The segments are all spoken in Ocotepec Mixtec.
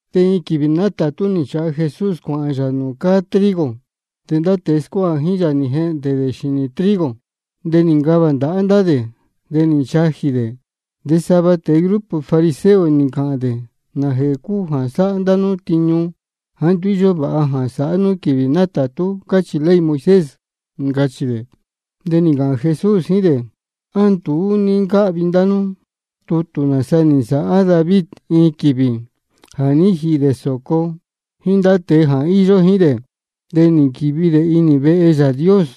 De iin quīvī nátātú nī nchāha Jesús cuāhān yā nūū cáá trigo. De ndá tēe scuáha jíín yā nī jehndē dē xīnī trigo, de nī ncavā ndāhá dē, de nī nchajī dē. De sava tēe grupo fariseo nī ncāhān dē: ¿Nājēhē cúu jā sáhá ndá nú tiñu jāá nduú íyó vāha jā sāhá nú quīvī nátātú, cáchī ley Moisés? ncachī dē. De nī ncāhān Jesús jíín dē: ¿A nduú ní ncáhvi ndá nú tutū nāsa nī nsāhá David iin quīvī jā ní jīhī dē sōco jíín ndá tēe jā ní īyo jíín dē? De nī nquīvi dē inī vehe Yāā Dios.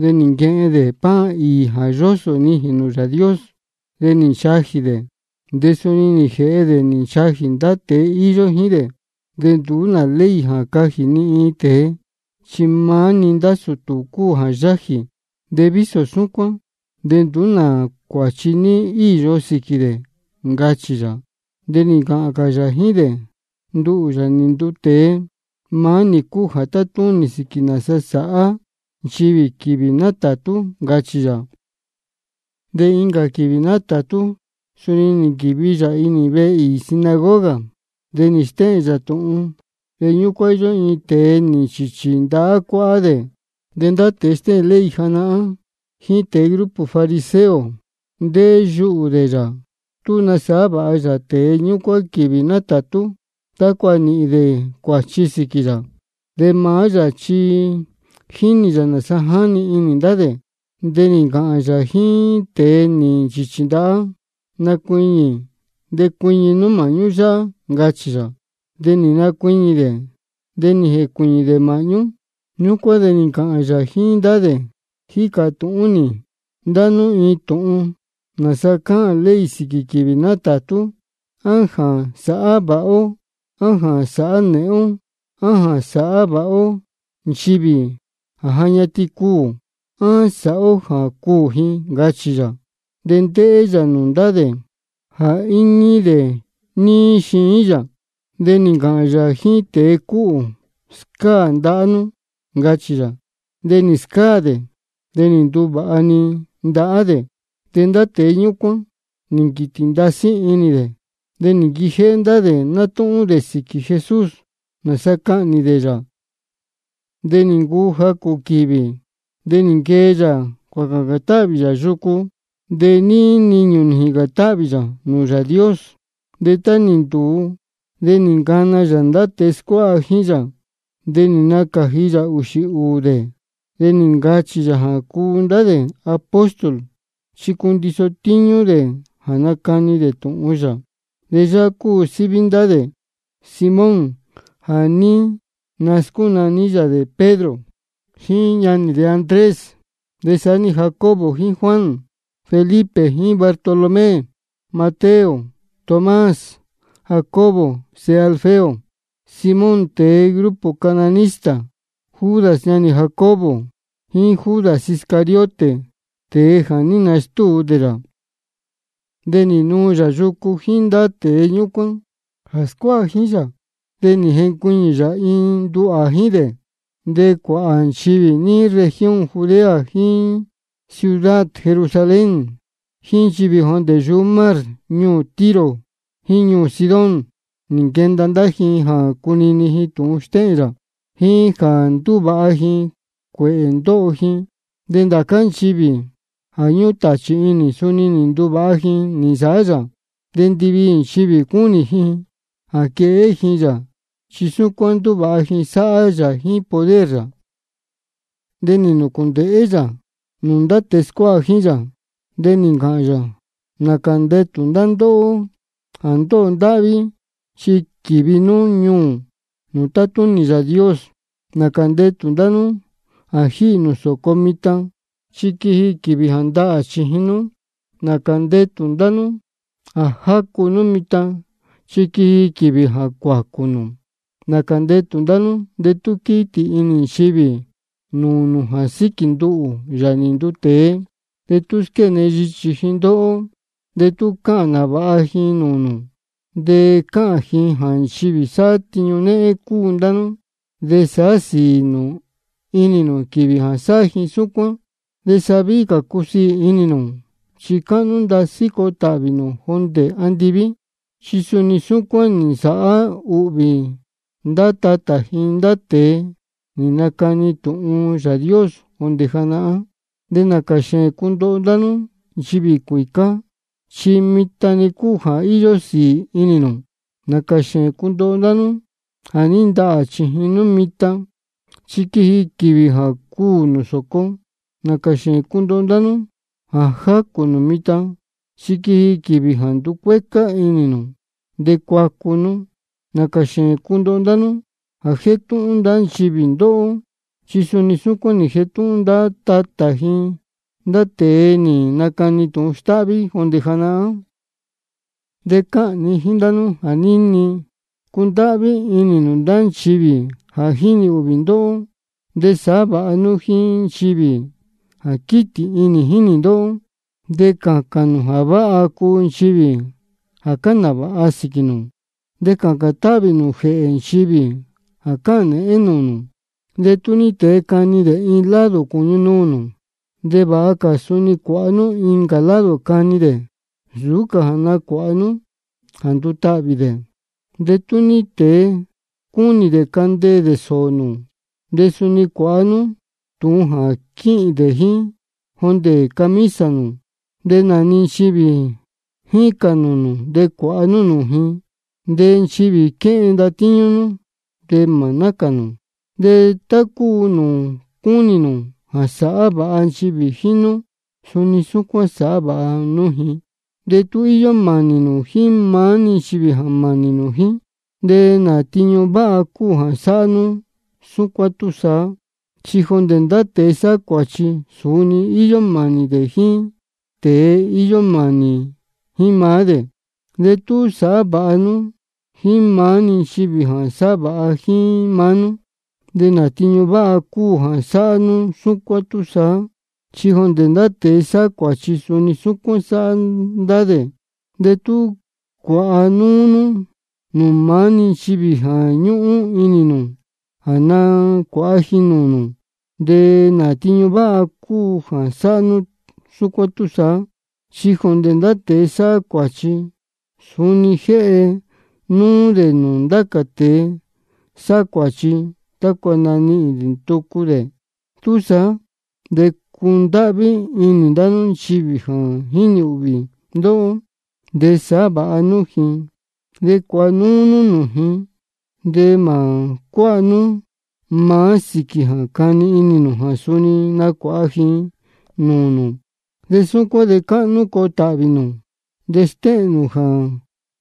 De nī nquehen dē pan īī jā yósō nijīn nūū Yāā Dios. De nī nchajī dē, de suni nī jēhe dē nī nchajī ndá tēe íyó jíín dē. De nduú nā ley jā cajī ni iin tēe, chi maá-ni ndá sūtū cúu jā yájī. De vísō súcuán de nduú nā cuāchi ní íyo sīquī dē, ncachī yā. De nī ncāhān cā yā jíín dē: Nduhū, Yāā nī nduu tēe, maá nī cúu jā tátúnī sīquī nāsa sāhá nchivī quīvī nátātú, ncachī yā. De incā quīvī nátātú suni nī nquīvi yā inī vehe īī sinagoga, de nī stéhēn yā tūhun. De ñúcuán íyó iin tēe nī nchīchī ndahá cuáhá dē. De ndá tēe stéhēn ley janahán jíín tēe grupo fariseo, ndéhé yuhū dē yā tú nasāhá vāha yā tēe ñúcuán quīvī nátātú, tácua nīhīn dē cuāchi sīquī yā. De maá yā chi jínī yā nāsa jáni inī ndá dē. De nī ncāhān yā jíín tēe nī nchīchī ndahá: Nacuiñī de cuiñi nú māhñú yáhá, ncachī yā. De nī nacuiñī dē, de nī jēcuīñī dē māhñú. Ñúcuán de nī ncāhān yā jíín ndá dē: Jícā tūhún nī ndá nú iin tūhun: ¿Nāsa cáhān ley sīquī quīvī nátātú? ¿A jā sāhá vāha ó, á jā sāhá nēhén ó? ¿A jā nasāhá vāha ó nchivī ja ñatin cuū, á sāhá ó jā cuū ji? ncachī yā. De ndéhé yā nūū ndá dē jā íñí dē níí xiín yā, de nī ncāhān yā jíín tēe cúhū: Scáā ndahá nú, ncachī yā. De nī scáā dē, de nī nduvāha-ni ndahá dē. De ndá tēe ñúcuán nī nquītī ndasí inī dē, de nī nquijéhé ndá dē nátúhún dē sīquī Jesús, nāsa cahnī dē yā. De nī ncuu jacū quīvī, de nī nquee yā cuācācān táhvī yā yucu. De níí niñū nī jīcān táhvī yā nūū Yāā Dios. De tá nī ntūu, de nī ncana yā ndá tēe scuáha jíín yā. De nī nacāji yā ūxī ūū dē, de nī ncachī yā jā cuu ndá dē apóstol, chi cundiso tíñú dē jā nacani dē tūhun yā. De yáhá cúu síví ndá dē: Simón jā ní nascúnaní yā dē Pedro, jíín ñanī dē Andrés, de saá-ni Jacobo jíín Juan, Felipe jíín Bartolomé, Mateo, Tomás, Jacobo sēhe Alfeo, Simón tēe grupo cananista, Judas ñanī Jacobo, jíín Judas Iscariote, tēe jā ní nastúu dē yā. De nī nuu yā yucu jíín ndá tēe ñúcuán jā scuáha jíín yā, de nī jencuiñī yā iin nduhā jíín dē. De cuāhā nchivī níí región Judea jíín ciudad Jerusalén, jíín nchivī jondē yuhú mar ñuū Tiro jíín ñuū Sidón, nī nquenda ndá ji jā cunini ji tūhun stéhēn yā, jíín jā nduvāha ji cuēhē ndóho ji. De ndācá nchivī jā ñúhún tāchī inī, suni nī nduvāha ji nī nsāhá yā. De ndiviī nchivī cúnī ji jā quehé ji yā, chi súcuán ndúvāha ji sáhá yā jíín poder yā. De nī nūcūndēhé yā nūū ndá tēe scuáha jíín yā, de nī ncāhān yā: Nācā ndetū ndá ndóhó jā ndóho ndáhví, chi quīvi nú ñuū nūū tátúnī Yāā Dios. Nācā ndetū ndá nú jā jíhī nū sōco mitan, chi quiji quīvī jā ndahā chījin nú. Nācā ndetū ndá nú jā jácu nú mitan, chi quiji quīvī jā cuācū nū. Nācā ndetū ndá nú de tú quítī inī nchivī nūū nū jā síquī nduhū, Yāā nī nduu tēe, de tú squéne yichī ji ndóhó, de tú cáhān nāvāha ji nūū nū, de cáhān ji jā nchivī sáhá tiñu néhén cúu ndá nú. De sāhá sīī nū inī nū quīvī jā sáhá ji súcuán, de sa víhí cā cusiī inī nū, chi cáhnú ndasí coo tāhvī nū jondē andiví. Chi suni súcuán nī nsāhá ūhvī ndá tatā ji ndá tēe nī nacani tūhun Yāā Dios jondē janahán. De nācā xēēn cundoho ndá nú nchivī cuīcá, chi mitan-ni cúu jā íyó sīī inī nū. Nācā xēēn cundoho ndá nú jā ní ndahā chījin nú mitan, chi quiji quīvī jā cuū nū sōco. Nācā xēēn cundoho ndá nú jā jácū nū mitan, chi quiji quīvī jā nducuécá inī nū de cuacu nú. Nācā xēēn cundoho ndá nú jā jétúhún ndá nchivī ndóhó, chi suni súcuán nī jetúhún ndá tatā ji ndá tēe nī nacani tūhun stáhví jondē janahán. De cáhān ni jíín ndá nú jā níni: Cundáhví inī nū ndá nchivī jā jínī ūhvī ndóhó, de sāhá vāha nú jíín nchivī jā quítī inī jínī ndóhó. De cācān nū jā váha cuu nchivī jā cáhān nāvāha sīquī nū, de cācān táhvī nū jēhē nchivī jā cáhān nēhén nūū nū. De tú ní tēe cani dē iin lado cūñu nuū nū, de vāha cā suni cuāha nú incā lado cani dē, nsūú cā jā nacuāha nú jā ndutahvī dē. De tú ní tēe cúnī dē candeē dē sōō nū, de suni cuāha nú tūhun jā quíhīn dē jíín jondē camisa nū. De nā-ni nchivī jícān nūū nū de cuāha nú nūū ji. De nchivī quéhen ndatíñú nú, de mā nácān nū. De tá cúu nūū cúnī nū jā sāhá vāha nchivī jíín nú, suni súcuán sāhá vāha nú ji. De tú íyó mānī nū jíín maá-ni nchivī jā mānī jíín nú, ¿de nā tiñu váha cúu jā sáhá nú súcuán túsaá? Chi jondē ndá tēe sáhá cuāchi, suni íyó mānī dē jíín tēe íyó mānī jíín maá dē. De tú sáhá vāha nú jíín maá-ni nchivī jā sáhá vāha jíín maá nú, ¿de nā tiñu váha cúu jā sáhá nú súcuán túsaá? Chi jondē ndá tēe sáhá cuāchi, suni súcuán sáhá ndá dē. De tú cuāha núú nú nūū maá-ni nchivī jā ñúhún inī nū jā nacuāha ji nūū nū, ¿de nā tiñu váha cúu jā sáhá nú súcuán túsaá? Chi jondē ndá tēe sáhá cuāchi, suni jéhe núú dē nūū ndá cā tēe sáhá cuāchi, tácua nanihīn tucu dē. Túsaá de cundáhví inī ndá nú nchivī jā jínī ūhvī ndóhó, de sāhá vāha nú ji, de cuāha núú nú nūū ji. De mā cuáha nú maá sīquī jā cani inī nū jā suni nacuāha ji nūū nū. De súcuán de cáhnú coo tāhvī nū, de stéhēn nū jā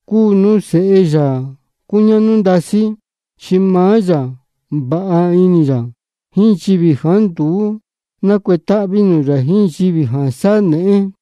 cúu nú sēhe Yāā cúñáhnú ndasí. Chi maá yā vāha inī yā jíín nchivī jāá nduú nácuetáhví nūū yā jíín nchivī jā sáhá nēhén.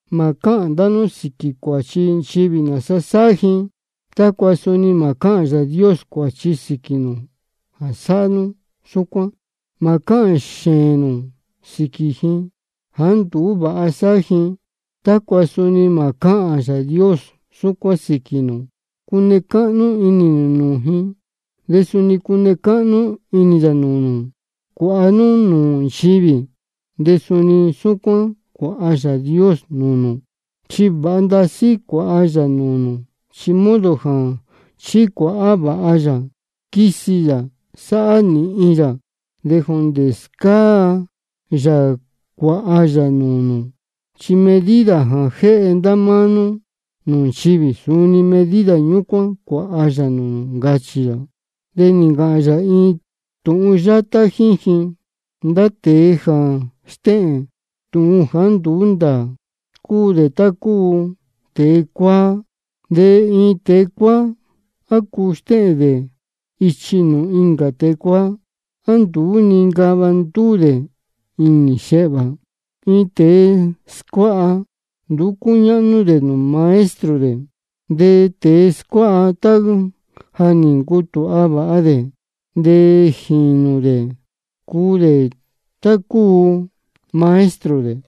Mā cáhān ndá nú sīquī cuāchi nchivī nāsa sáhá ji, tácua suni mā cáhān Yāā Dios cuāchi sīquī nū jā sáhá nú súcuán. Mā cáhān xēēn nū sīquī ji jāá nduú vāha sáhá ji, tácua suni mā cáhān Yāā Dios súcuán sīquī nū. Cune cáhnú inī nū nūū ji, de suni cune cáhnú inī yā nūū nū. Cuāha nú nūū nchivī, de suni súcuán cuāha Yāā Dios nūū nū. Chi vāha ndasí cuāha yā nūū nū, chi modo jā chicuāha vāha yā, quisi yā, sāhá nīhin yā, de jondē scáa yā cuāha yā nūū nū. Chi medida jā jéhe ndá nú nūū nchivī, suni medida ñúcuán cuāha yā nūū nū, ncachī yā. De nī ncāhān yā iin tūhun yátá jíín ji: Ndá tēe jā stéhēn tūhun jāá nduú ndāā, cúu dē tá cúu tēe cuáá. De iin tēe cuáá, ¿á cuu stéhēn dē ichi nūū incā tēe cuáá? ¿A nduú nincava ndúū dē inī xēhvā? Iin tēe scuáha, nduú cúñáhnú dē nūū maestro dē. De tēe scuáha, tá ja nī ncutūha vāha dē, de jīnū dē cuu dē tá nūū cúu maestro dē.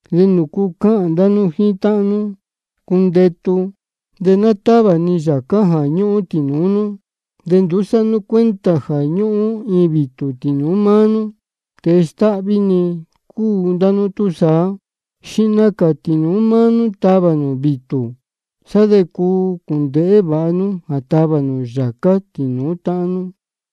¿De nūcu cáhān ndá nú jíín táhán nú: Cundetu, de ná távā ni yācá jā ñúhún tīnūú nú, de nduú sáhá nú cuenta jā ñúhún iin vītū tīnūú máá nú? Tēe stáhví-ni cúu ndá nú túsaá. Xihna cā tīnūú máá nú tavā nū vītū, sá de cuu cūndēhé vāha nú jā tavā nū yācá tīnūú táhán nú.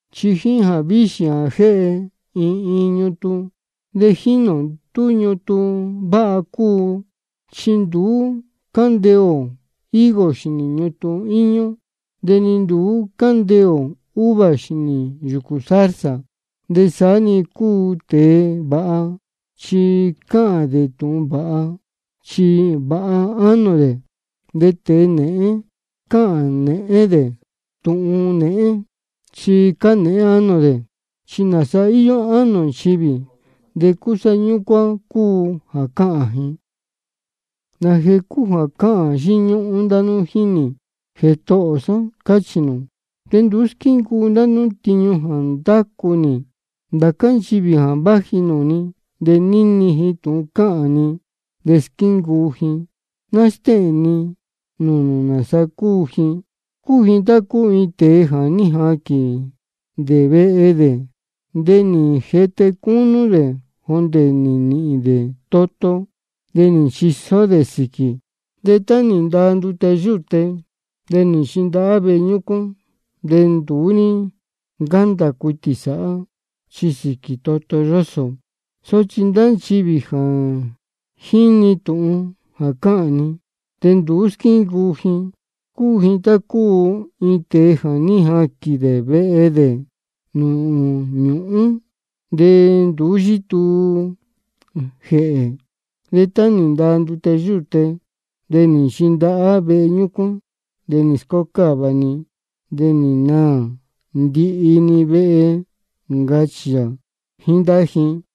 Chi jíín jāvíxī jā jéhe iin iin ñutun de jínī ō tú ñutun váha cúu. Chi nduú cándeē ō higo xīnī ñutun íñú, de ni nduú cándeē ō uva xīnī yūcū zarza. De saá-ni cúu tēe vāha, chi cáhān dē tūhun váha, chi vāha ánō dē. De tēe nēhén cáhān dē tūhun nēhén, chi cánēhén ánō dē. Chi nāsa íyó ánō nchivī, de cúsá ñúcuán cúu jā cáhān ji. ¿Nājēhē cúu jā cáhān yíñúhún ndá nú jíín nī: Jētohō sá, cáchī nū, de nduú squíncuu ndá nú tiñu jā ndácu nī? Ndācá nchivī jā váji nūū ni de níni ji tūhun cáhān ni de squíncuu ji, ná stéhēn ni nūū nū nāsa cúu ji: Cúu ji tá cúu iin tēe jā ní jaquīn dē vehe dē, de nī jete cúnú dē jondē nī nīhīn dē toto, de nī nchisó dē sīquī. De tá nī ndaa ndute yúte, de nī nchindahá vehe ñúcuán, de nduú ní ncándā cuitī sāhá, chi sīquī toto yósō. Sochi ndá nchivī jā jíni tūhun jā cáhān ni, de nduú squíncuu ji, cúu ji tá cúu iin tēe jā ní jaquīn dē vehe dē nūū ñūhún, de nduú yítuu jēhē. De tá nī ndaa ndute yúte, de nī nchindahá vehe ñúcuán, de nī scócáva-ni, de nī naā ndihi-ni vehe, ncachī yā jíín ndá ji.